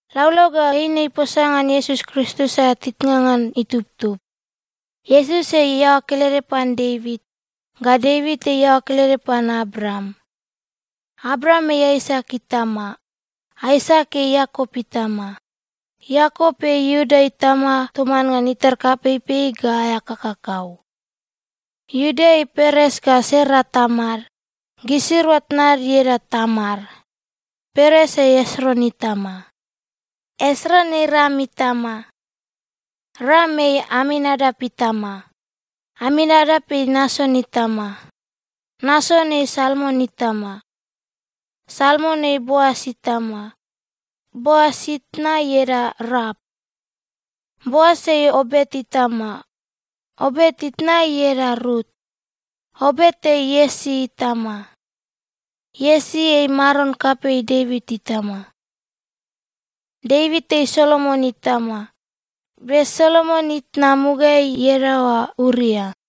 Laulau ga eine iposa ngan Iesus Kristus aea titnga ngan itubtub. Iesus ei iaoa kelede pan Devit, ga Devit ei iaoa kelede pan Abraam. Abraam ei Aisak itama. Aisak ei Iakop itama. Iakop ei Iuda itama toman ngan itar kapeipei ga aea kakakau. Iuda ei Peres ga Sera tamad. (Gisirua tnad ieda Tamar.) Peres ei Esron itama. Esron ei Ram itama. Ram ei Aminadap itama. Aminadap ei Nason itama. Nason ei Salmon itama. Salmon ei Boas itama. (Boas itna ieda Raap.) Boas ei Obet itama. (Obet itna ieda Rut.) Obet ei Iesi itama. Iesi ei maron kapei Devit itama. Devit ei Solomon itama. (Be Solomon itna, mugaeai iadaoa Uria.)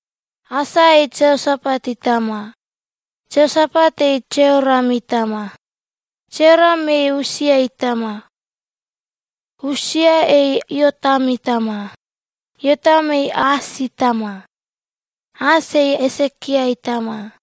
Asa ei Jeosapat itama. Jeosapat ei Jeoram itama. Jeoram ei Usia itama. Usia ei Iotam itama. Iotam ei Aas itama. Aas ei Esekia itama.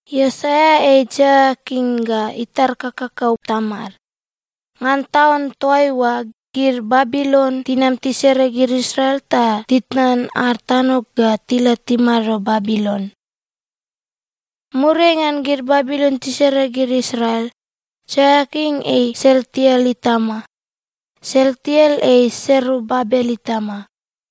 Iosaia ei Jeoiakin ga itar kakakau tamad. Ngan taun toaiua, gid Babilon tinam tisere gid Israel ta titnan ad tano ga tila timado Babilon. Muriai ngan gid Babilon tisere gid Israel, Jeoiakin ei Sealtiel itama. Sealtiel ei Serubabel itama.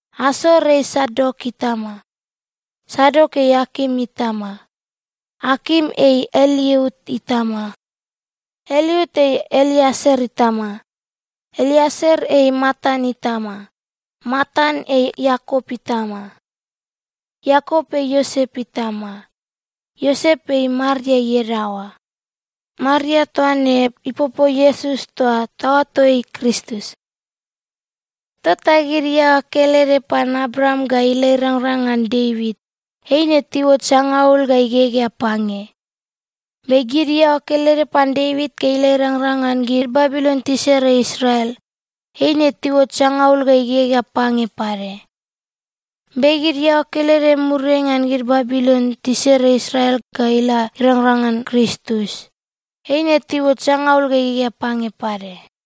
Asor ei Sadok itama. Sadok ei Akim itama. Akim ei Eliut itama. Eliut ei Eleasar itama. Eleasar ei Matan itama. Matan ei Iakop itama. Iakop ei Iosep itama. Iosep ei Maria iadaoa. Maria toaine ipopo Iesus toa taoato ei Kristus. Tota gid iaoa kelede pan Abraam ga ila irangrang ngan Devit, eine tiuot sangaul ga igegea pange. Be gid iaoa kelede pan Devit ga ila irangrang ngan gid Babilon tisere Israel, eine tiuot sangaul ga igegea pange pade. Be gid iaoa kelede muriai ngan gid Babilon tisere Israel ga ila irangrang ngan Kristus, eine tiuot sangaul ga igegea pange pade.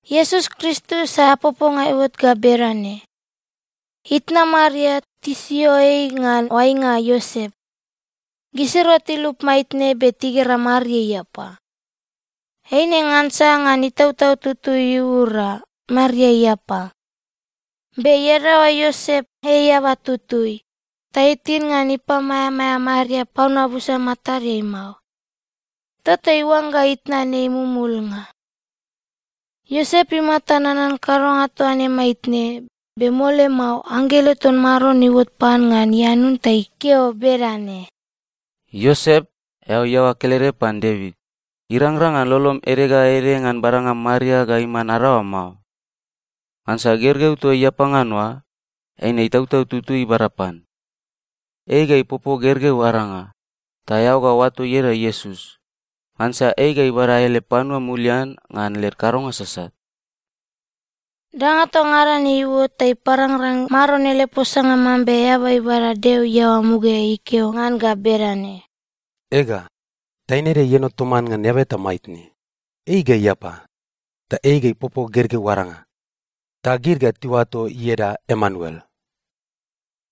Iesus Kristus aea poponga iuot ga bedane: Itna Maria, tisio ei ngan oainga Iosep. Gisirua tilup maitne, be tigera Maria iapa. Eine ngansa ngan Itautau Tutui iura, Maria iapa. Be iadaoa Iosep ei eaba tutui, ta itin ngan ipamaeamaea Maria panua busa matadeai mao. Tota iuangga itnan ei mumulnga. Iosep imata nanan kadonga toa ne maitne, be mole mao, anggelo ton Maron iuot pan ngan ianun ta ikeo bedane, “Iosep, eao iaoa kelede pan Devit, irangrang ngan lolom ede ga ede ngan badanga Maria ga iman adaoam mao. Ngansa gergeu toa iapa ngan oa, eine Itautau Tutui ibada pan. Ei ga ipopo gergeu aranga, ta eao ga oato ieda Iesus, ngansa ei ga ibada ele panua mulian ngan led kadonga sasat.” Danga toa ngada ne iuot ta iparangrang Maron ele posanga mambe eaba ibada Deo iaoa mugaeai ikeo ngan ga bedane, “Ega, taine ede ieno toman ngan eaba eta maitne, ei ga iapa. Ta ei ga ipopo gergeu aranga, ta gid ga tiuato ieda Emanuel.”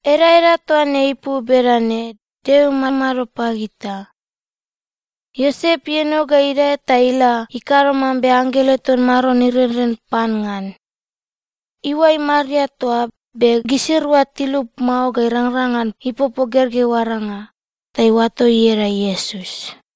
(Edaeda toa ne ipu bedane, “Deo imamado pagita.”) Iosep ieno ga idae ta ila ikado mambe anggelo ton Maron irenren pan ngan. Iuai Maria toa, be gisirua tilup mao ga irangrang ngan ipopo gergeu aranga. Ta iuato ieda Iesus.